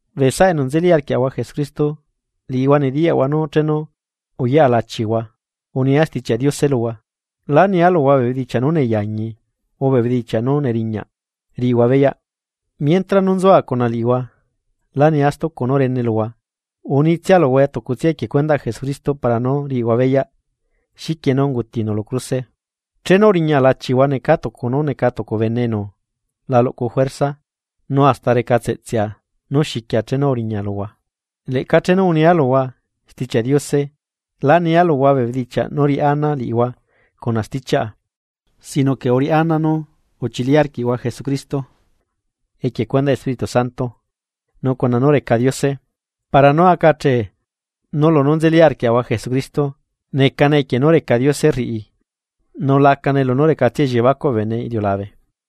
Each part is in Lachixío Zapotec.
Bee saꞌa enu nzeli arquiaꞌahua Jesucristo liꞌihua nediyaꞌhua nú chenu uyaꞌa lachihua, unia Stichiaꞌ Diose luhua, lá nia luhua bee bedichiaꞌ nú neyaañi o bee bedichiaꞌ nú neriñaꞌ riꞌihua beyaꞌ, mientra nú nzua cuna liꞌihua, lá nia stucu nú rene luhua, unitsia luhua tucutsia equie cuendaꞌ Jesucristo para nú riꞌihua beyaꞌ xiquie nú ungutinu lu cruse. Chenu uriña lachihua necaa tucu nú neca tucu bene enu la luꞌcu juerzaꞌ nu hasta recatseꞌtseꞌa nú xiquia chenu uriña luhua. Leꞌca chenu unia luhua Stichiaꞌ Diose, lá nia luhua bee bedichiaꞌ nú riꞌá ana liꞌihua cuna stichiaꞌa, sino que uriꞌá ana nú uchili arquiꞌhua Jesucristo equie cuendaꞌ Espíritu Santo nu cuna poderꞌ Diose. Para nú aca achee nú lunú nzeli arquiaꞌahua Jesucristo necane equie nú reca Diose rriꞌi nu lacane lunú recatsia elliebacuꞌ bee bene iliulabe.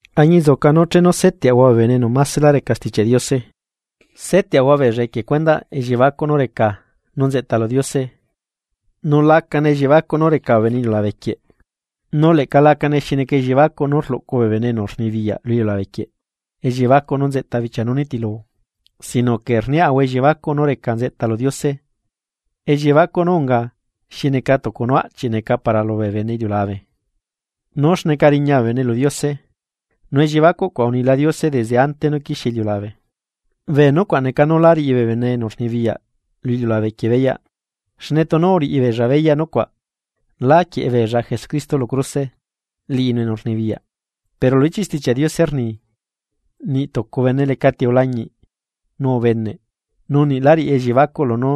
Añinzuca nú chenu seteꞌahua bee bene enu másela reca Stichiaꞌ Diose, seteꞌahua beella equie cuendaꞌ elliebacuꞌ nú reca nú nzeꞌta lu Diose, nu la necane elliebacuꞌ nú reca bee bene iliulabe quieꞌ nu leꞌca lacane xi neca elliebacuꞌ nú rluꞌcu bee enu rnibiyaꞌ lu iliulabe quieꞌ, elliebacuꞌ nú nzeꞌta bichia nú nitilu. Sino que rniaꞌahua elliebacuꞌ nú reca nzeꞌta lu Diose, elliebacuꞌ nú unga xi neca tucu nú aꞌchiꞌ neca para lubee bene iliulabe nú xneca riña bee bene lu Diose. Nu elliebacuꞌ cuaꞌ unila Diose desde ante nú quixie iliulabe. Bee nucuaꞌ neca nú lá riꞌi bee bene enu rnibiyaꞌ lu iliulabe quieꞌ beyaꞌ, xne tunu uriꞌi beella beyaꞌ nucuaꞌ, lá quieꞌe beella Jesucristo lu cruse, liꞌinu enu rnibiyaꞌ. Pero lu ichiꞌ Stichiaꞌ Diose rni: Niꞌ tucu bene lecati ulañiꞌ, nu ubeneꞌ, nu niꞌ lá riꞌi elliebacuꞌ lunú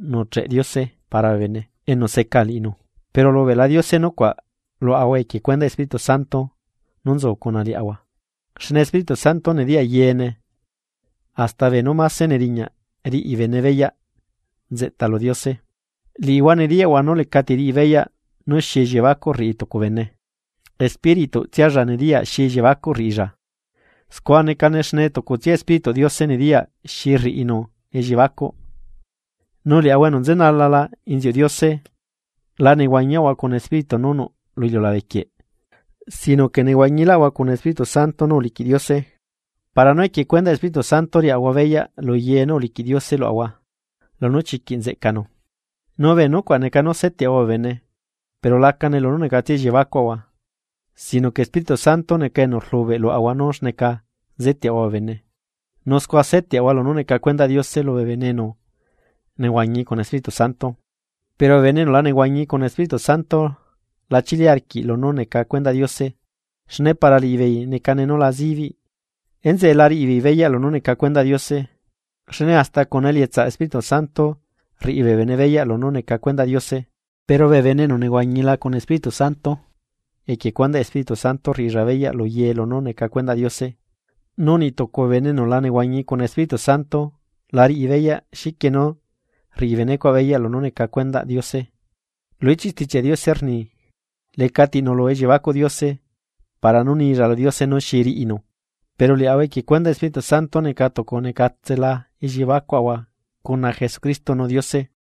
nuꞌcheꞌ Diose para bee bene enu seca liꞌinu. Pero ulubeꞌla Diose nucuaꞌ luaꞌahua equie cuendaꞌ Espíritu Santo nú nzu cuna liaꞌahua, xne Espíritu Santo nediyaꞌ yeene, hasta beenú máse neriñaꞌ riꞌi bene beyaꞌ nzeꞌta lu Diose. Liꞌihua nediyaꞌhua nú lecati riꞌi beyaꞌ nú xi elliebacuꞌ rriꞌi tucu bene, espírituꞌtsialla nediyaꞌ xi elliebacuꞌ rriꞌilla. Scua necane xne tucutsia Espírituꞌ Diose nediyaꞌ xi rriꞌinu elliebacuꞌ. Nu liaꞌahua enu nzenalala inziuꞌ Diose, la nehuañiaꞌahua cuna espíritu nú nuꞌ lu iliulabe quieꞌ sino que nehuañilaꞌahua cuna Espíritu Santo nú uliquiꞌ Diose, para nú equie cuendaꞌ Espíritu Santo riaꞌahua beyaꞌ luye nú uliquiꞌ Diose luaꞌahua lunú chiquiꞌ nzeꞌcanu. Nu bee nucuaꞌ neca nú seteꞌahua bee bene, pero lacane lunú necatsia elliebacuꞌahua, sino que Espíritu Santo neca enu rlubeꞌ luaꞌahua nú xneca seteꞌahua bee bene. Nu scua seteꞌahua lunú neca cuendaꞌ Diose lubee bene enu nehuañi cuna Espíritu Santo. Pero bee bene enu la nehuañi cuna Espíritu Santo la chili arquiꞌ lunú neca cuendaꞌ Diose, xne para liꞌibeei necane nú la zibiꞌ. Enzeꞌe la riꞌibeei beyaꞌ lunú neca cuendaꞌ Diose, xne hasta cuna elietsaꞌ Espíritu Santo rriꞌi bee bene beyaꞌ lunú neca cuendaꞌ Diose. Pero bee bene enu nehuañila cuna Espíritu Santo equie cuendaꞌ Espíritu Santo rriꞌilla beyaꞌ luye lunú neca cuendaꞌ Diose, nu niꞌtucu bee bene enu la nehuañi cuna Espíritu Santo la riꞌi beyaꞌ xiquie nú rriꞌi benecuaꞌ beyaꞌ lunú neca cuendaꞌ Diose. Lu ichiꞌ Stichiaꞌ Diose rni: “Lecati nuꞌlu elliebacuꞌ Diose para nú nilla lu Diose nú xi riꞌinu.” Pero liaꞌahua equie cuendaꞌ Espíritu Santo neca tucu necatsela elliebacuaꞌahua cuna Jesucristo nu Diose.